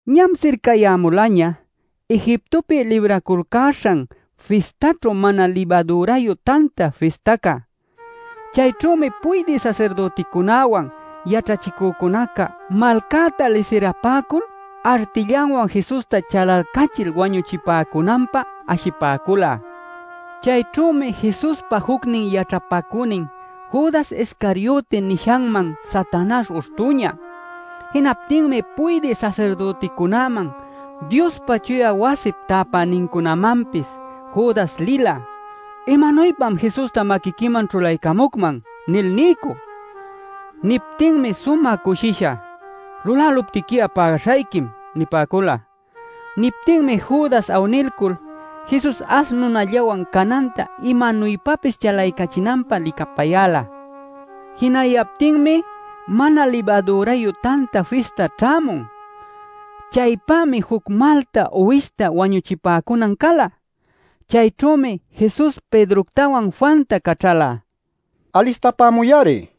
Ñam sircayämulaña Egiptopi Libraculcäśhan Fistaćhu Mana Libadürayu Tanta Fistaca. Chayćhümi puydï sasirdüticunäwan yaćhachicücunaca malcäta lisirapäcul artillawan Jesusta chalalcachil wañuchipäcunanpä ashipäcula. Chayćhümi Jesuspa jucnin yaćhapacünin Judas Iscarioti nishanman Satanaśh uśhtüña. Jinaptinmi puydï sasirdüticunäman, Diospa chuya wasip täpänincunämanpis Judas lila “¿Imanuypam Jesusta maquiquiman ćhulaycämucman?” nil niycü. Niptinmi sumä cushisha: “Luläluptiqui'a pägaśhayquim” nipäcula. Niptinmi Judas awnilcul Jesus ash nunallawan cananta imanuypapis chalaycachinanpä licapayäla. Jinayaptinmi Mana Libadürayu Tanta Fista ćhämun. Chaypämi juc malta uwishta wañuchipäcunan cala. Chayćhümi Jesus Pedroctawan Juanta caćhala: “Alistapämuy-ari” nil.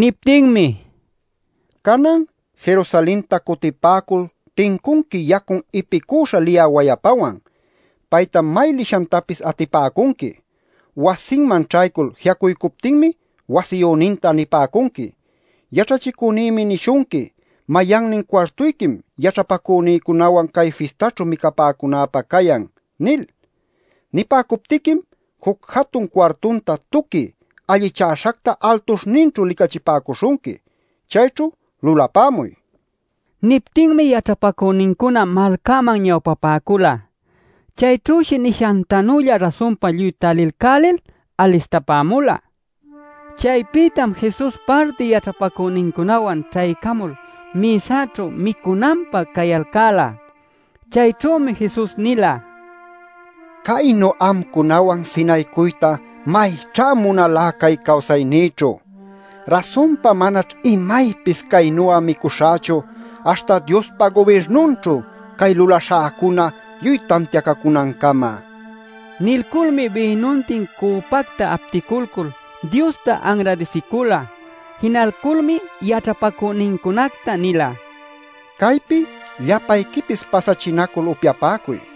Niptinmi: “Canan Jerusalenta cutipäcul tincunqui yacun ipicüśha liyä wayapawan. Paytam may lishantapis atipäcunqui. Wasinman ćhaycul ji'acuycuptinmi wasiyüninta nipäcunqui: ‘Yaćhachicünïmi nishunqui “¿Mayannin cuartuyquim yaćhapacünïcunawan cay fistaćhu micapäcunäpä cayan?” ’ nil. Nipäcuptiquim juc jatun cuartunta tuqui allichäśhacta altuśhninćhu licachipäcuśhunqui. Chayćhu lulapämuy” nila. Niptinmi yaćhapacünincuna malcaman ñawpapäcula. Chayćhüshi nishantanülla rasunpa lluy talilcälil alistapämula. Chaypïtam Jesus parti yaćhapacünincunäwan ćhaycamul mïsaćhu micunanpä cayalcäla. Chayćhümi Jesus nila: “Caynu amcunawan sinaycuyta mayćhá munalá cay cawsaynïćhu. Rasunpa manaćh imaypis caynu'a micuśhächu aśhta Diospa gubirnunćhu cay lulaśhäcuna lluy tantiacacunancama” nil. Nilculmi bïnuntin cüpacta apticulcul Diosta anradisicula. Jinalculmi yaćhapacünincunacta nila: “Caypi llapayquipis pasachinacul upyapäcuy.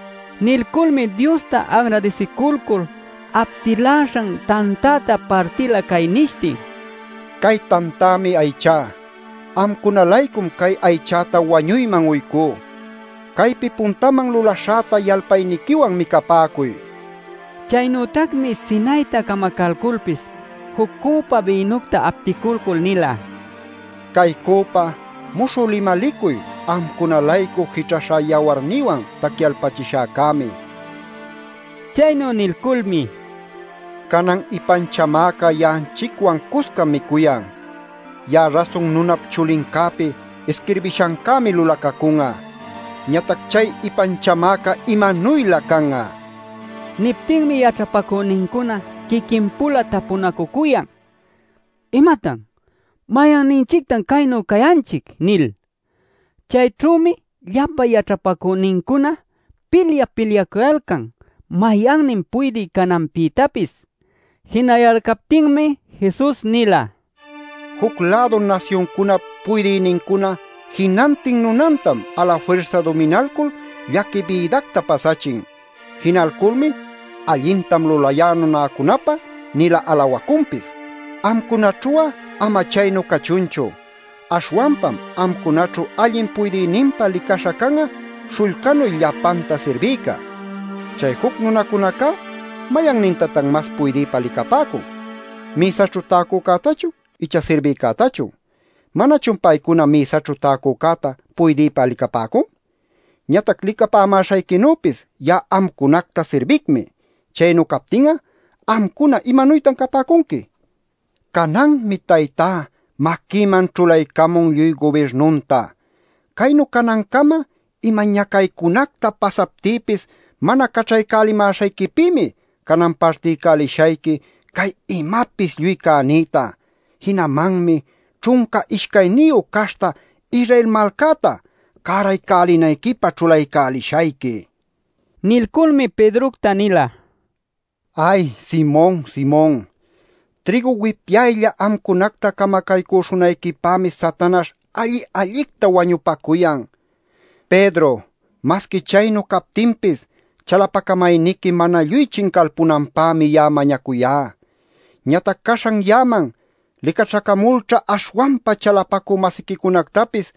Nilculmi Diosta anradisiculcul aptiläśhan tantäta partila cay nishtin: “Cay tantämi aychá. Amcuna-laycum cay aychäta wañuyman uycú. Caypi puntaman lulaśhäta yalpayniquiwan micapäcuy” nil. Chaynütacmi sinayta camacalculpis juc cüpa bïnucta apticulcul nila: “Cay cüpa muśhü limalicuy amcuna-laycu jićhaśhá yawarnïwan tacyalpachishäcämi” nil. Chaynu nilculmi: “Canan ipanchamäca ya'anchicwan cuscam micuyan. Ya'a Rasun Nunap Chulincäpi isquirbishancämi lulacacun'a. Ñatac ¡chay ipanchamäca imanuylä can'a!” nin. Niptinmi yaćhapacünincuna quiquin-pula tapunacucuyan: “¡¿Imatan?! ¡¿Mayanninchictan chaynu cayanchic?!” nil. Chayćhümi llapa yaćhapacünincuna pilyap-pilyacuyalcan mayannin puydï cananpïtapis. Jinayalcaptinmi Jesus nila: “Juc-lädu nasyuncunap puydïnincuna jinantin nunantam alafirsa duminalcul llaqui bïdacta pasachin. Jinalculmi ‘Allintam lulayá nunäcunapä’ nil'a alawacunpis. Amcunaćhu'a ama chaynu cachunchu. Aśhwanpam amcunaćhu allin puydïninpa licaśha can'a śhullcanuy llapanta sirbïca. Chay juc nunacunacá ¿mayannintatan mas puydïpa licapäcun? ¿Mïsaćhu täcücätachun icha sirbïcätachun? ¿Manachun paycuna mïsaćhu täcücäta puydïpa licapäcun? Ñatac licapämäśhayquinüpis ya'a amcunacta sirbicmi. Chaynu captin'a amcuna ¿imanuytan capäcunqui? “Cananmi Taytá maquïman ćhulaycamun lluy gubirnunta. Caynu canancama ima ñacaycunacta pasaptïpis mana caćhaycälimäśhayquipïmi canan partiycälishayqui cay imapis lluy cänïta. Jinamanmi ćhunca ishcayniyu caśhta Israel malcäta cäraycälinayquipä ćhulaycälishayqui” nil. Nilculmi Pedrocta nila: “Ay, Simon, Simon. Trïgu wipyaylla amcunacta camacaycüśhunayquipämi Satanaśh alli-allicta wañupacuyan. Pedro, masqui chaynu captinpis chalapacamayniqui mana lluy chincalpunanpämi ya'a mañacuyá. Ñatac caśhan ya'aman licaćhacamulćha aśhwanpa chalapacü-masiquicunactapis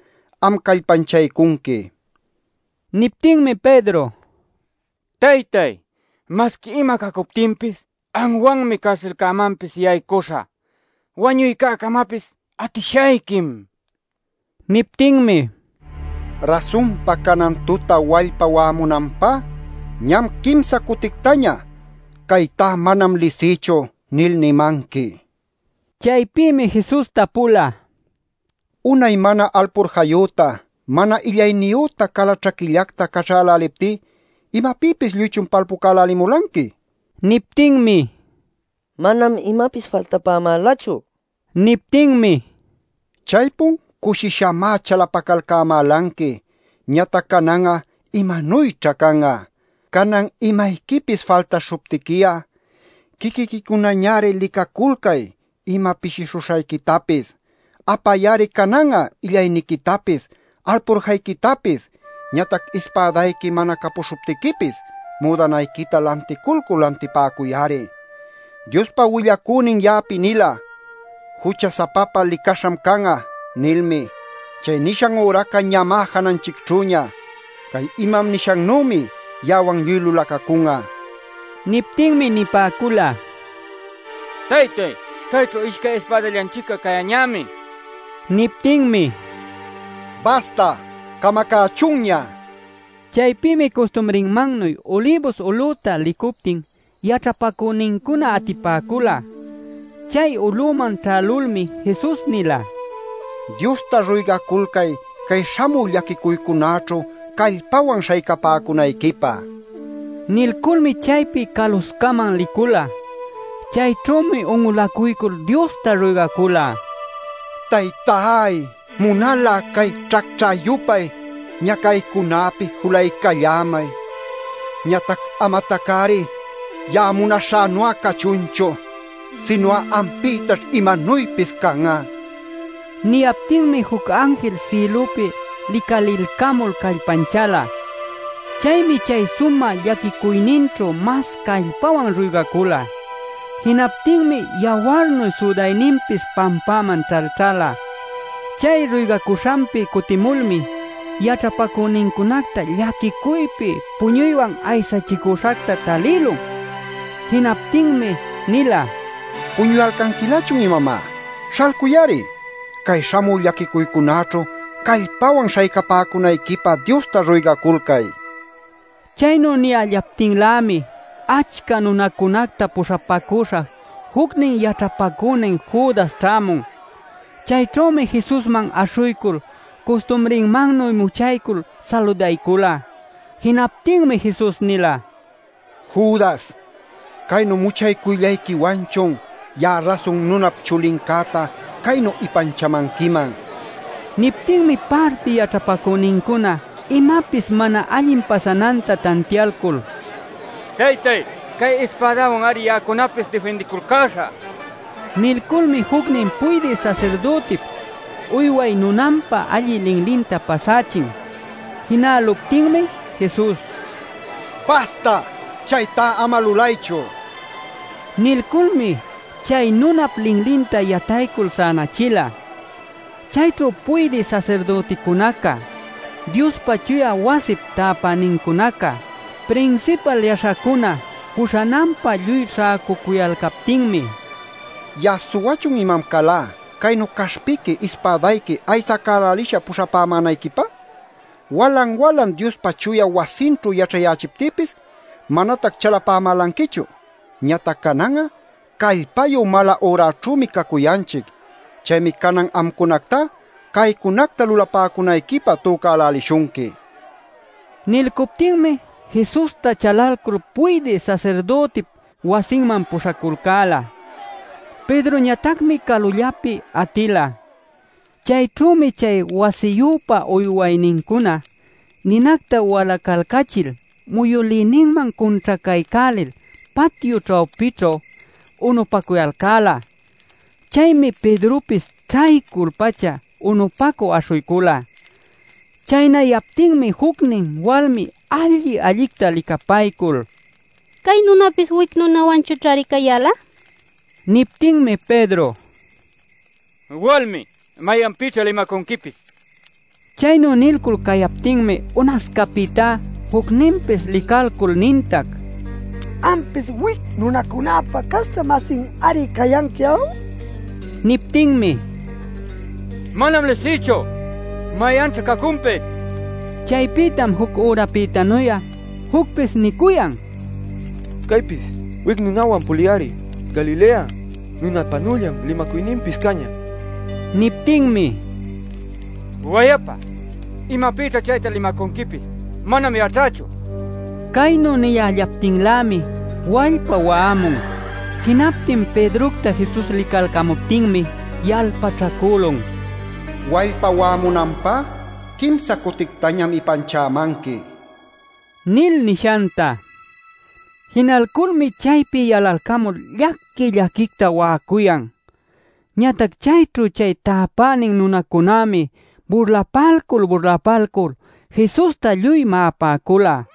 am callpanchaycunqui” nila. Niptinmi Pedro: “¡Taytáy, masqui ima cacuptinpis anwanmi carsilmanpis yaycuśhä! ¡Wañuycäcamapis atishayquim!” nila. Niptinmi: “Rasunpa canan tuta wallpa wa'amunanpá ñam quimsa cutictaña ‘¡Caytá manam lisïchu!’ nil nimanqui” nila. Chaypïmi Jesus tapula: “Unay mana alpurjayüta, mana illayniyüta, cala ćhaquillacta caćhäläliptí ¿imapïpis lluychun palpucälälimulanqui?” nil. Niptinmi: “Manam imapis faltapämälachu” nipäcula. Niptinmi: “Chaypun cushishamá chalapacalcämälanqui, ñatac canan'a ¿imanuyćha can'a? Canan imayquipis faltaśhuptiqui'a quiquiquicunañari licaculcay ima pishishuśhayquitapis. Apay-ari canan'a illayniquitapis, alpurjayquitapis. Ñatac ispädayqui mana capuśhuptiquipis, müdanayquita lanticulcul lantipäcuy-ari. “Diospa willacünin ya'api nila: ‘Jucha-sapapä licaśham can'a’ nilmi. Chay nishan üraca ñamá jananchicćhüña. Cay imam nishannümi ya'awan lluy lulacacun'a” nila. Niptinmi nipäcula: “Taytáy, cayćhu ishcay ispädallanchic'a cayäñämi” nil. Niptinmi: “¡Basta, camacächunña!” nila. Chaypïmi custumrinmannuy Ulibus ulüta licuptin yaćhapacünincuna atipäcula. Chay ulüman ćhälulmi Jesus nila: “Diosta ruygaculcay cay śhamü llaquicuycunäćhu callpawan śhaycapäcunayquipä” nil. Nilculmi chaypi caluscaman licula. Chayćhümi un'ulacuycul Diosta ruygacula: “Taytáy, munal'a cay ćhacćhä-yupay ñacaycunäpi julaycallämay. Ñatac amatac-ari ya'a munaśhänu'a cachunchu, sinu'a ampïtaćh imanuypis can'a” nil. Niyaptinmi juc anjil sïlupi licalilcamul callpanchäla. Chaymi chay sumä llaquicuyninćhu mas callpawan ruygacula. Jinaptinmi yawarnu südayninpis pampäman ćhalćhala. Chay ruygacuśhanpi cutimulmi yaćhapacünincunacta llaquicuypi puñuywan aysachicüśhacta talïlun. Jinaptinmi nila: “¿Puñuyalcanquilächun imamá? Śhalcuy-ari. Cay śhamü llaquicuycunäćhu callpawan śhaycapäcunayquipä Diosta ruygaculcay” nil. Chaynu niyällaptinlämi achca nunacunacta puśhapacüśha jucnin yaćhapacünin Judas ćhämun. Chayćhümi Jesusman aśhuycul custumrinmannuy muchaycul saludaycula. Jinaptinmi Jesus nila: “Judas ¿caynu muchaycuyllayquiwanchun ya'a Rasun Nunap Chulincäta caynu ipanchämanquiman?” nil. Niptinmi parti yaćhapacünincuna imapis mana allin pasananta tantialcul: “Taytay, cay ispädawan-ari ya'acunapis difindiculcäśhä” nila. Nilculmi jucnin puydï sasirdütip uyway nunanpa allï linlinta pasächin. Jinäluptinmi Jesus: “¡Basta! ¡Chaytá ama lulaychu!” nila. Nilculmi chay nunap linlinta yataycul sänachila. Chayćhu puydï sasirdüticunaca, Diospa chuya wasip täpänincunaca, prinsipal yaśhacuna puśhananpä lluy śhäcucuyalcaptinmi: “¿Ya'a suwachun imam calá caynu caśhpiqui ispädayqui aysacälälisha puśhapämänayquipä? Walan-walan Diospa chuya wasinćhu yaćhayächiptïpis manatac chalapämälanquichu. Ñatac canan'a callpayu mala-üraćhünümi cacuyanchic. Chaymi canan amcunactá caycunacta lulapäcunayquipä tücälälishunqui” nila. Nilcuptinmi Jesusta chalalcul puydï sasirdütip wasinman puśhaculcäla. Pedroñatacmi calullapi atila. Chayćhümi chay wasiyüpa uywaynincuna ninacta walacalcachil muyülïninman cunćhacaycälil patyu ćhawpićhu unupacuyalcäla. Chaymi Pedropis ćhaycul-pacha unupacü aśhuycula. Chaynayaptinmi jucnin walmi alli-allicta licapaycul: “Cay nunäpis wic nunäwanchućhari cayäla” nin. Niptinmi Pedro: “Walmi, ¿mayanpïćha limacunquipis?” nila. Chaynu nilcul cayaptinmi unascapïtá jucninpis licalcul nintac: “Ampis wic nunacunäpa caśhta-masin-ari cayanqui, ¿aw?” nil. Niptinmi: “Manam lisïchu. ¿Mayanćha cacunpis?” nila. Chaypïtam juc ürapïtanu'a jucpis nicuyan: “Caypis wic nunäwan pulï-ari. Galilea nunäpanüllam limacuyninpis cañä” nil. Niptinmi: “Wayapa ¿imapïćha chayta limacunquipis? ¡Manam yaćhächu!” Caynu niyällaptinlämi wallpa wa'amun. Jinaptin Pedrocta Jesus licalcämuptinmi yalpaćhacülun “Wallpa wa'amunanpá quimsa cutictañam ipanchämanqui” nil nishanta. Jinalculmi chaypi yalalcamul llaqui-llaquicta wa'acuyan. Ñatac chayćhu chay täpänin nunacunämi burlapalcul burlapalcul Jesusta lluy ma'apäcula.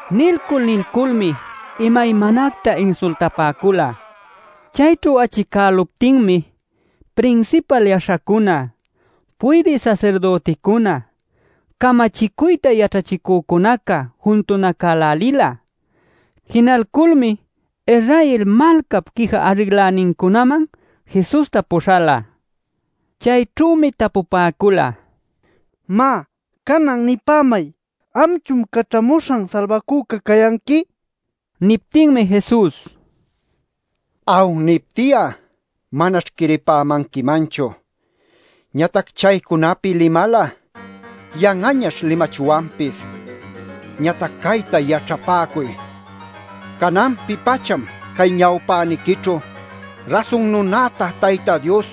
Nilcul nilculmi imaymanacta insultapäcula. Chayćhu achicäluptinmi prinsipal yaśhacuna, puydï sasirdüticuna, camachicuyta yaćhachicücunaca juntunacälälila. Jinalculmi Israel malcap quija arrinlänincunaman Jesusta puśhala. Chayćhümi tapupäcula: “Má, canan, nipämay ¿amchun Caćhamuśhan Salbacüca cayanqui?” nil. Niptinmi Jesus: “ ‘Aw’ nipti'a manaćh quiripämanquimanchu. Ñatac chaycunapi limal'a, yan'añaćh limachwanpis. Ñatac cayta yaćhapäcuy: cananpi-pacham cay ñawpäniquićhu Rasun Nunäta Tayta Dios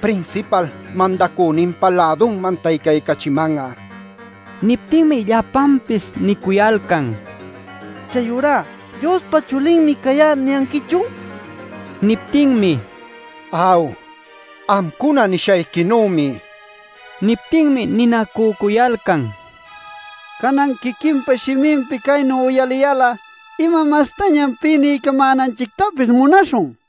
prinsipal mandacüninpä lädunman taycaycachiman'a” nin. Niptinmi llapanpis nicuyalcan: “¿Chayurá ‘Diospa Chulinmi cayá’ niyanquichun?” nil. Niptinmi: “Aw, amcuna nimäśhayquinümi” nila. Niptinmi ninacücuyalcan: “Canan quiquinpa shiminpi caynu uyaliyal'a ¿ima mastañam pï niycamänanchictapis munaśhun?” nil.